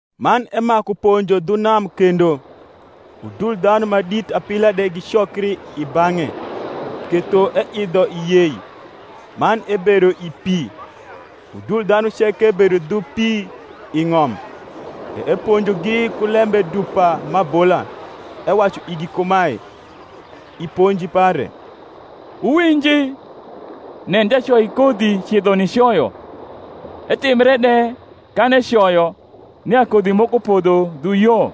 Man emaku ponjo dhu nam kendo. Udul dhanu ma dit apila de gicokri i bang’e, ketho eidho i yei, man ebedo i pi; udul dhanu ceke bedo dhu pi i ng’om. E eponjogi ku lembe dupa m’abola, ewacu igi kumae, i ponji pare, Wuwinji: Nen, jacoikodhi cidho nicoyo: etimbre de, kan ecoyo, nia kodhi moko podho dhu yo,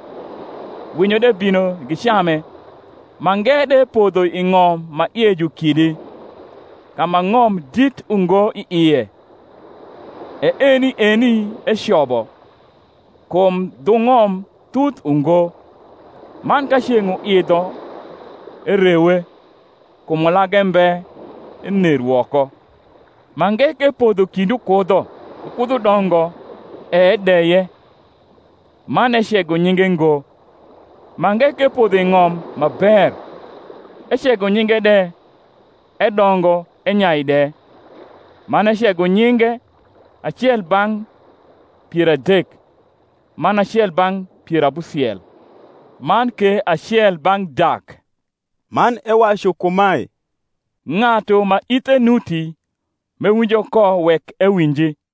winyo de bino gicame. Mange de podho i ng’om ma ie ju kidi, ka ma ng’om dit ungo i ie; e eni eni ecobo, kum dhu ng’om thuth ungo: man ka ceng’ uidho, erewe; kum ulage mbe, ener woko. Mange ke podho kind ukudho, ukudho dongo, e edeye, man ecego nyinge ngo. Mange ke podho i ng’om ma ber, ecego nyinge de, edongo enyai de; man ecego nyinge, acel bang’ pier adek, man acel bang’ pier abusiel, man ke acel bang’ dak. Man ewacu kumae, Ng’atu ma ithe nuti m’ewinjo ko, wek ewinji.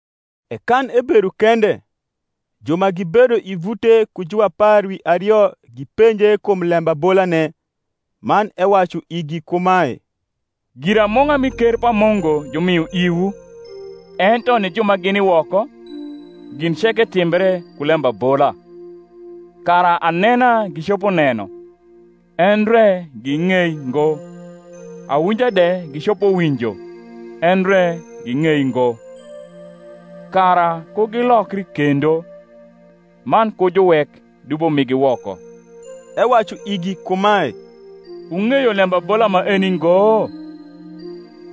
E kan ebedo kende, ju ma gibedo i vute ku juapar wi ario gipenje kum lembabolane. Man ewacu igi kumae, Giramung’a mi ker pa Mungu jumio iwu: ento ni ju ma gini woko, gin ceke timbre ku lembabola: kara anena gicopo neno, endre ging’ei ngo; awinja de gicopo winjo, endre ging’ei ngo; kara ku gilokri kendo, man ku juwek dubo migi woko. Ewacu igi kumae, Wung’eyo lembabola maeni ngo?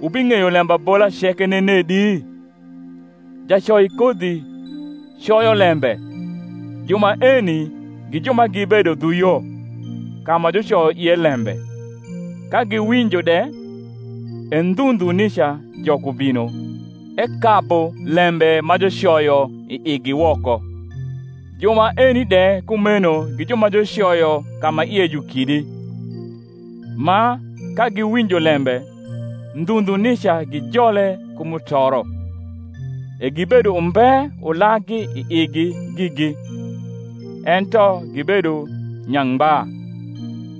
wubing’eyo lembabola ceke nenedi? Jacoikodhi coyo lembe. Ju maeni gi ju ma gibedo dhu yo, ka ma jucoyo ie lembe; ka giwinjo de, e ndhu ndhu nica Jok ubino, ekabu lembe majucoyo i igi woko. Ju maeni de kumeno gi ju ma jucoyo ka ma ie ju kidi, ma, ka giwinjo lembe, ndhu ndhu nica gijole ku mutoro; e gibedo umbe ulaggi i igi gigi, ento gibedo nyangba;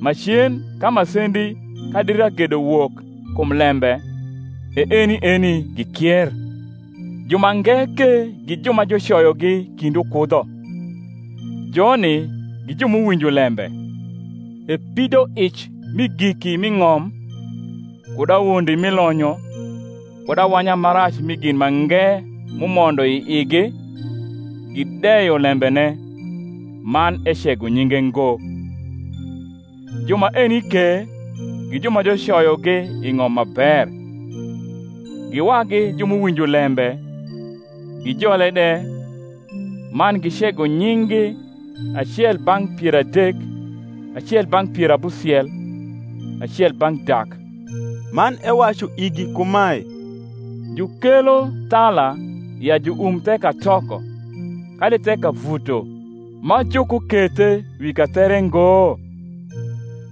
macen, ka masendi kadi ragedo wok kum lembe, e eni eni gikier. Jumange ke gi ju ma jucoyogi kind ukudho; joni gi ju m’uwinjo lembe, e pidoic mi giki mi ng’om, kud awondi mi lonyo, kud awanya ma rac mi gin mange m’umondo i igi, gideyo lembene, man ecego nyinge ngo. Ju maeni ke gi ju ma jucoyogi i ng’om ma ber; gi wagi ju m’uwinjo lembe, gijole de, man gicego nying’gi, acel bang’ pier adek, acel bang’ pier abusiel, acel bang’ dak. Man ewacu igi kumae, Jukelo thala ya juum the katoko, kadi the kavuto, ma jukukethe wi kathere ngo?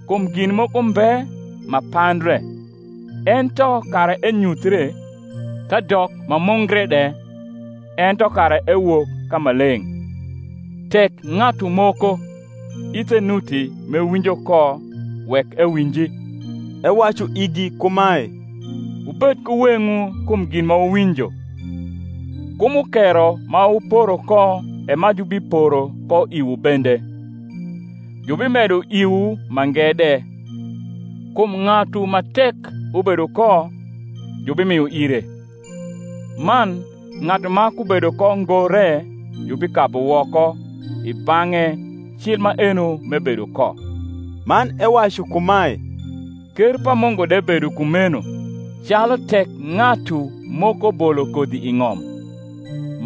Kum gin moko mbe ma pandre, ento kara enyuthre, kadok ma mungre de, ento kara ewok ka ma leng’. Tek ng’atu moko ithe nuti m’ewinjo ko, wek ewinji. Ewacu igi kumae, Wubed ku weng’wu kum gin ma wuwinjo: ku mukero ma wuporo ko e ma jubiporo ko iwu bende: jubimedo iwu mange de. Kum ng’atu ma tek ubedo ko, jubimio ire: man ng’atu ma kubedo ko ngo re, jubikabu woko i bang’e cil maeno m’ebedo ko. Man ewacu kumae, Ker pa Mungu de bedo kumeno, calu tek ng’atu moko bolo kodhi i ng’om;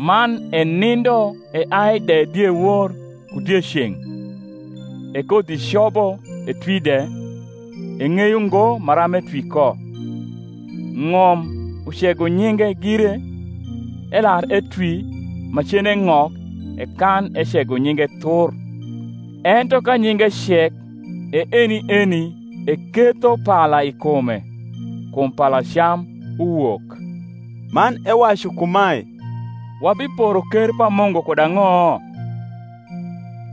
man enindo eai de diewor ku dieceng’, e kodhi cobo etwi de, eng’eyo ngo maram etwi ko. Ng’om ucego nyinge gire; elar etwi, macen eng’ok, e kan ecego nyinge thur. Ento ka nyinge cek, e eni eni eketho pala i kume, kum palacam uwok. Man ewacu kumae, Wabiporo ker pa Mungu kud ang’o?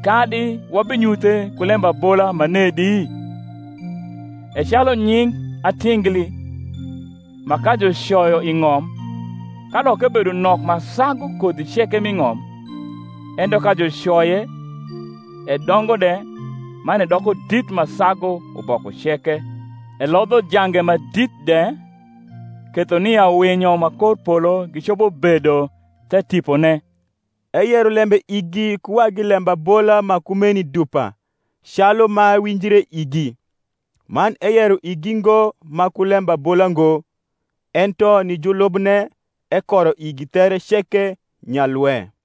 kadi wabinyuthe ku lembabola manedi? E calu nying atingli, ma ka jucoyo i ng’om, kadok ebedo nok ma sagu kodhi ceke m’i ng’om, ento ka jucoye, edongo de, man edoko dit ma sagu uboko ceke, elodho jange ma dit de; ketho nia winyo ma kor polo gicopo bedo the tipone. Eyero lembe igi ku wagi lembabola ma kumeni dupa, calu ma winjre igi; man eyero igi ngo ma ku lembabola ngo: ento ni julubne ekoro igi there ceke nyalwe.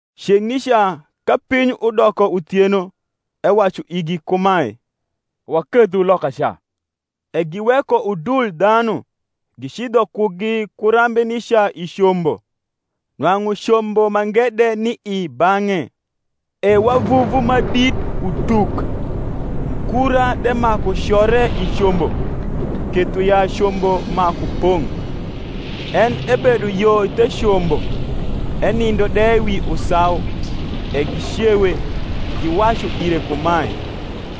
Ceng’ nica, ka piny udoko uthieno, ewacu igi kumae, Wakedhu lokaca. E giweko udul dhanu, gicidho kugi ku rambe nica i combo. Nwang’u combo mange de ni i bang’e. E wavuvu ma dit utuk, mukura de maku core i combo, ketho ya combo maku pong’. En ebedo yo the combo, enindo de wi usau: e gicewe, giwacu ire kumae,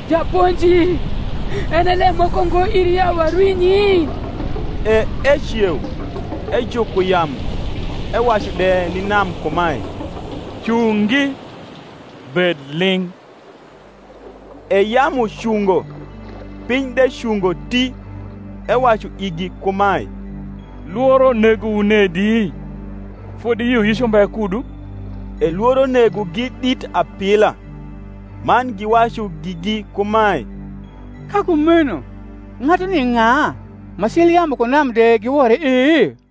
Japonji, en e lem moko ngo iri ya warwinyi? E eceu, ejuko yamu, ewacu de ni nam kumae, Cungi, bed ling’. E yamu cungo. piny de cungo ti. Ewacu igi kumae, Lworo negowu nedi? fodi yioyic umbe kudu? E lworo negogi dit apila, man giwacu gigi kumae, Ka kumeno ng’atuni ng’a, ma cil yamu ku nam de giwore e?